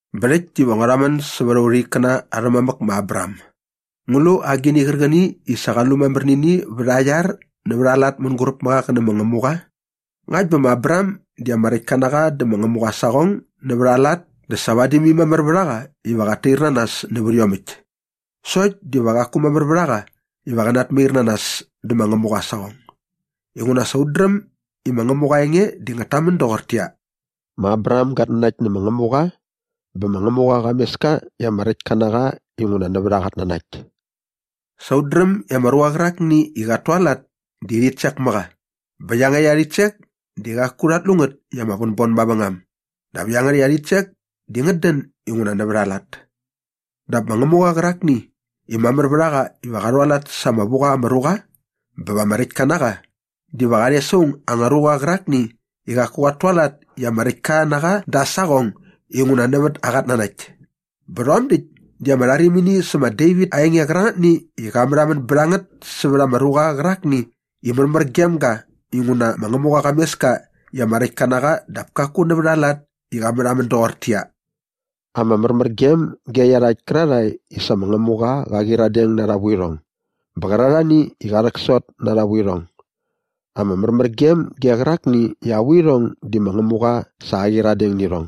Bä rhäkt diva ngua rhamän sävät aurha ikkäna arhä mamäk ma Abraham. Ngu lu agini qärqäni i sa qa lu mamär nä ini vät aa iar nävät aa lat mänguräp mä qa qä nä ma Ngamuqa? Ngakt bä ma Abraham di ama räktka na qa dä ma Ngämuqa aa saqong nävät aa lat dä sa vadi mai mamär vät a qa iva qat tair na nas nävät iomäkt. Sokt diva qaku mamär vät a qa iva qä natmair na nas dä ma Ngämuqa aa saqong inguna sa ut dräm i ma Ngämuqa aa enge di ngät tamän doqortäqyia, “Ma Abraham gat nanakt nä ma Ngämuqa bä ma Ngämuqa qa mes ka i ama räktka na qa inguna nävät aa qatnanakt.” Sa ut dräm i ama ruqa qärakni i qat tualat di rhit sek mä qa bä iangärhäkt aa rhitsek di qaku rhat lu ngät i ama vänbon mavängam dap iangärhäkt aa rhitsek di ngät dän inguna nävät aa lat. Dap ma Ngämuqa qärakni i mamär vät a qa iva qa rhualat sa ama vu qa ama ruqa bä va ama räktka na qa diva qa rhes aung anga ruqa qärakni i qaku qat tualat i ama räktka na qa da aa saqong inguna nävät aa qatnanakt. Bä rhom däkt di ama rharimini sä ma Devit aa enge qärangätni i qa märhamän bät a ngät sävät ama ruqa qärakni i märmär gem ga inguna ma Ngämuqa qa mes ka i ama räktka na qa dap kaku nävät aa lat i qa märhamän doqortäqyia, “Ama märmärgem ge iarhakt kärarhae i sa ma Ngämuqa qa qyiradeng na arha vuirhong bä qärarhani i qa rhäksot na arha vuirhong. Ama märmärgem ge qärakni i aa vuirhong di ma Ngämuqa sa qa qyiradeng nä irhong.”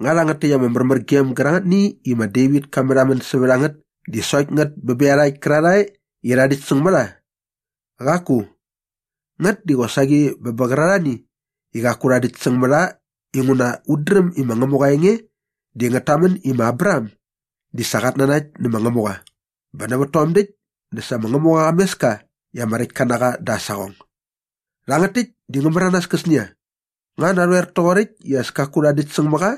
Nga rhangät täkt ama märmärgem gärangätni i ma Devit ka märhamän sävät a ngät di sokt ngät bä bä iarhakt kärarhae i rha däktsäng mä rha? Qaku. Ngät di qosaqi bä bä qärarhani i qaku rha däktsäng mä rha inguna ut dräm i ma Ngämuqa aa enge di ngät tamän i ma Abraham di sa qat nanakt nä ma Ngämuqa bä nävät tom däkt dä sa ma Ngämuqa qa mes ka i ama räktka na qa da aa saqong. Rhangät täkt di ngä märanas käsnia? Nga narhoer toqoräkt i as kaku rha däktsäng mä qa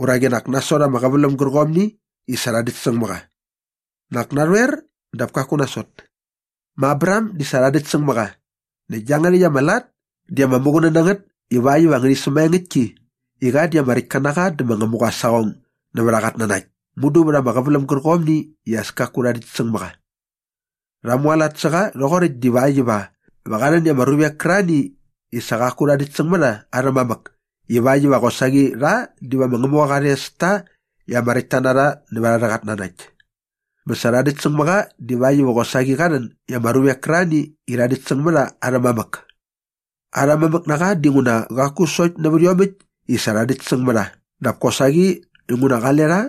ura qinak nasot ama qäväläm gärqomni i sa rha däktsäng mä qa? Nak narhoer dap kaku nasot. Ma Abraham di sa rha däktsäng mä qa näkt iangärhäkt ama lat di ama muqunän na ngät ivakt iva ngärhi sämaengäktki i qa di ama räktka na qa dä ma Ngämuqa aa saqong nävät aa qatnanakt mudu vät ama qäväläm gärqomni i as kaku rha däkt säng mä qa. Rha mualat sä qa rhoqoräkt divakt iva qa rhän i ama ruvek kärarhani i sa qaku rha däktsäng mä rha arhä mamäk ivakt iva qosaqi rha diva ma Ngämuqa qa rhes ta i ama räktta na rha nävät arhä qatnanakt. Bä sa rha däktsäng mä qa divakt iva qosaqi qa rhän i ama ruvek kärarhani i rha däktsäng mä rha arhä mamäk. Arhä mamäk na qa dinguna qaku sokt nävät iomäkt i sa rha däktsäng mä rha dap kosaqi nguna qale rha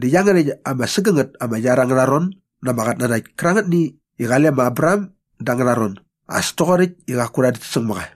dä iangärhäkt ama sägängät ama iar angärha ron na ama qatnanakt kärangätni i qale ma Abraham da angärha ron as toqoräkt i qaku rha däktsäng mä qa.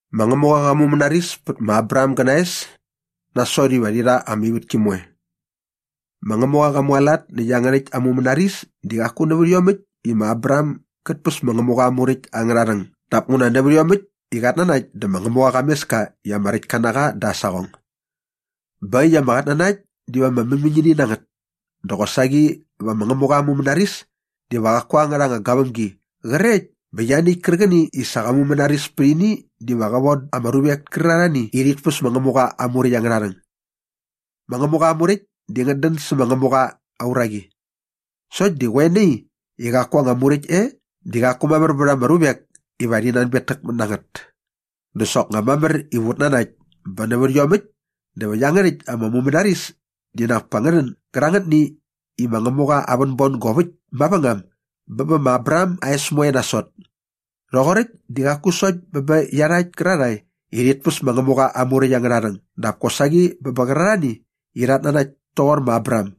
Ma Ngämuqa qa mumänaris pät ma Abraham gä na aa es nasot iva rha sa ama ivätki moe. Ma Ngämuqa qa mualat nä iangärhäkt ama mumänaris di qaku nävät iomäkt i ma Abraham gät päs ma Ngämuqa aa Muräkt angärha rhäng dap nguna nävät iomäkt i qat nanakt dä ma Ngämuqa qa mes ka i ama räktka na qa da aa saqong. Bä äkt i ama qatnanakt diva ama mäñmäñini na ngät dä qosaqi va ma Ngämuqa aa mumänaris diva qaku angärha anga gavämgi qrekt bä ianiäkt kärqäni i sa qa mumänaris pät ini diva qä von ama ruvek kärarhani i rhit päs ma Ngämuqa aa Muräkt angärha rhäng. Ma Ngämuqa aa muräkt di ngät dän sä ma Ngämuqa aa uraqi. Sokt di qoe nai i qaku anga Muräkt e di qaku mamär vät ama ruvek iva rhi nanbetäkmät na ngät. Dä soknga mamär iva ut nanakt bä nävät iomäkt dä va iangärhäkt ama mumänaris di nak pa ngä rhän gärangätni i ma Ngämuqa aa vänbon gop äkt mavängam bä bä ma Abraham aa es moe nasot. Rhoqoräkt di qaku sokt bä bä iarhakt kärarhae i rhit päs ma Ngämuqa aa Muräkt angärha rhäng dap kosaqi bä bä qärarhani i rhat nanakt toqor ma Abraham.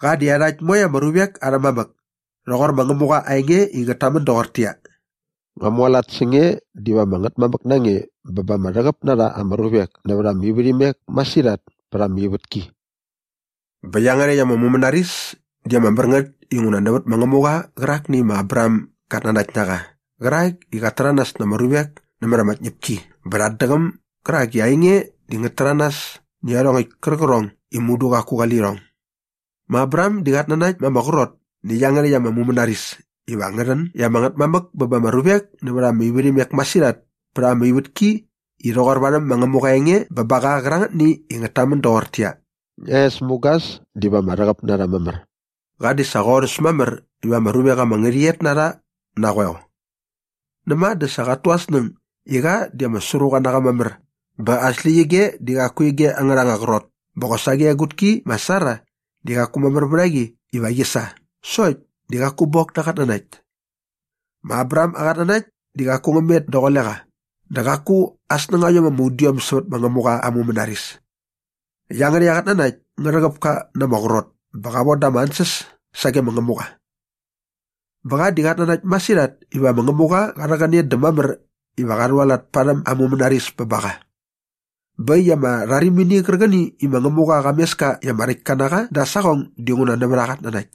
Qa di iarhakt moe ama ruvek arhä mamäk toqor ma Ngämuqa aa enge i ngät tamän doqortäqyia, “Ngua mualat sä nge diva ama ngätmamäk na nge bä ba ama rhäqäp na rha ama ruvek nävät ama ivärhimek masirhat pät ama ivätki.” Bä iangärhäkt ama mumänaris di ama mär ngät inguna nävät ma Ngämuqa qärakni i ma Abraham gat nanakt na qa qärak i qat täranas na ama ruvek nämät ama tñäpki bä rhat däqäm gärak i aa enge ngät täranas nä iarhongäkt kärqärhong i mudu qaku qali lirhong. Ma Abraham di qat nanakt ma ama qrot nä iangärhäkt ama mumänaris iva qa rhän i ama ngätmamäk bä ba ama ruvek nävät ama ivärhimek masirhat pät ama ivätki i rhoqor varhäm ma Ngämuqa aa enge bä ba qa qärangätni i ngät tamän doqortäqyia, “Ngia es mugas diva ama rhäqäp na rha mamär.” Qa di sa qorhäs mamär iva ama ruvek ama ngärhäqyet na rha na aa qoeo. Näma dä sa qat tu aa snäng i qa di ama sruqa na qa mamär bä aa släqyige di qaku ige angärha anga qrot bä qosaqi aa egutki ma Sara di qaku mamär vät a qi iva qi sa sokt di qaku bok da aa qatnanakt. Ma Abraham aa qatnanakt di qaku ngä met daqule qa dä qaku aa snängaiom aa udiom sävät ma Ngämuqa aa mumänaris. Iangärhäkt aa qatnanakt ngä rhäqäp ka na ama qrot bä qa von da ama ansäs sage ma Ngämuqa. Bä qa di qat nanakt masirhat iva ma Ngämuqa qa rhäqäne dä mamär iva qa rhualat parhäm aa mumänaris bä ba qa. Bä äkt i ama rharimini qärqäni i ma Ngämuqa qa mes ka i ama räktka na qa da aa saqong dinguna nävät aa qatnanakt.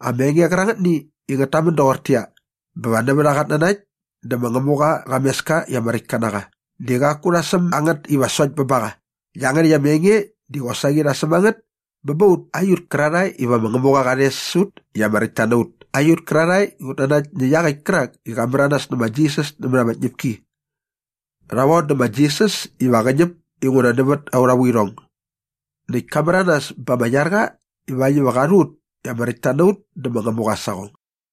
Ama enge qärangätni i ngät tamän doqortäqyia, “bä nävät aa qatnanakt dä ma Ngämuqa qa mes ka i ama räktka na qa” di qaku rha säm a ngät iva sokt bä ba qa. Iangärhäkt ama enge di qosaqi rha säm a ngät bä ba ut aiut kärarhae iva ma Ngämuqa qa rhes ut i ama räktta na ut aiut kärarhae i ut nanakt nä iaqäkt kärak i qa märanas nä ma Jisas nämät ama tñäpki. Rha vodäm ma Jisas iva qä ñäp inguna nävät aurha vuirhong. Näkt ka märanas bä ama iar qa ivakt iva qa rhu ut i ama räktta na ut dä ma Ngämuqa aa saqong.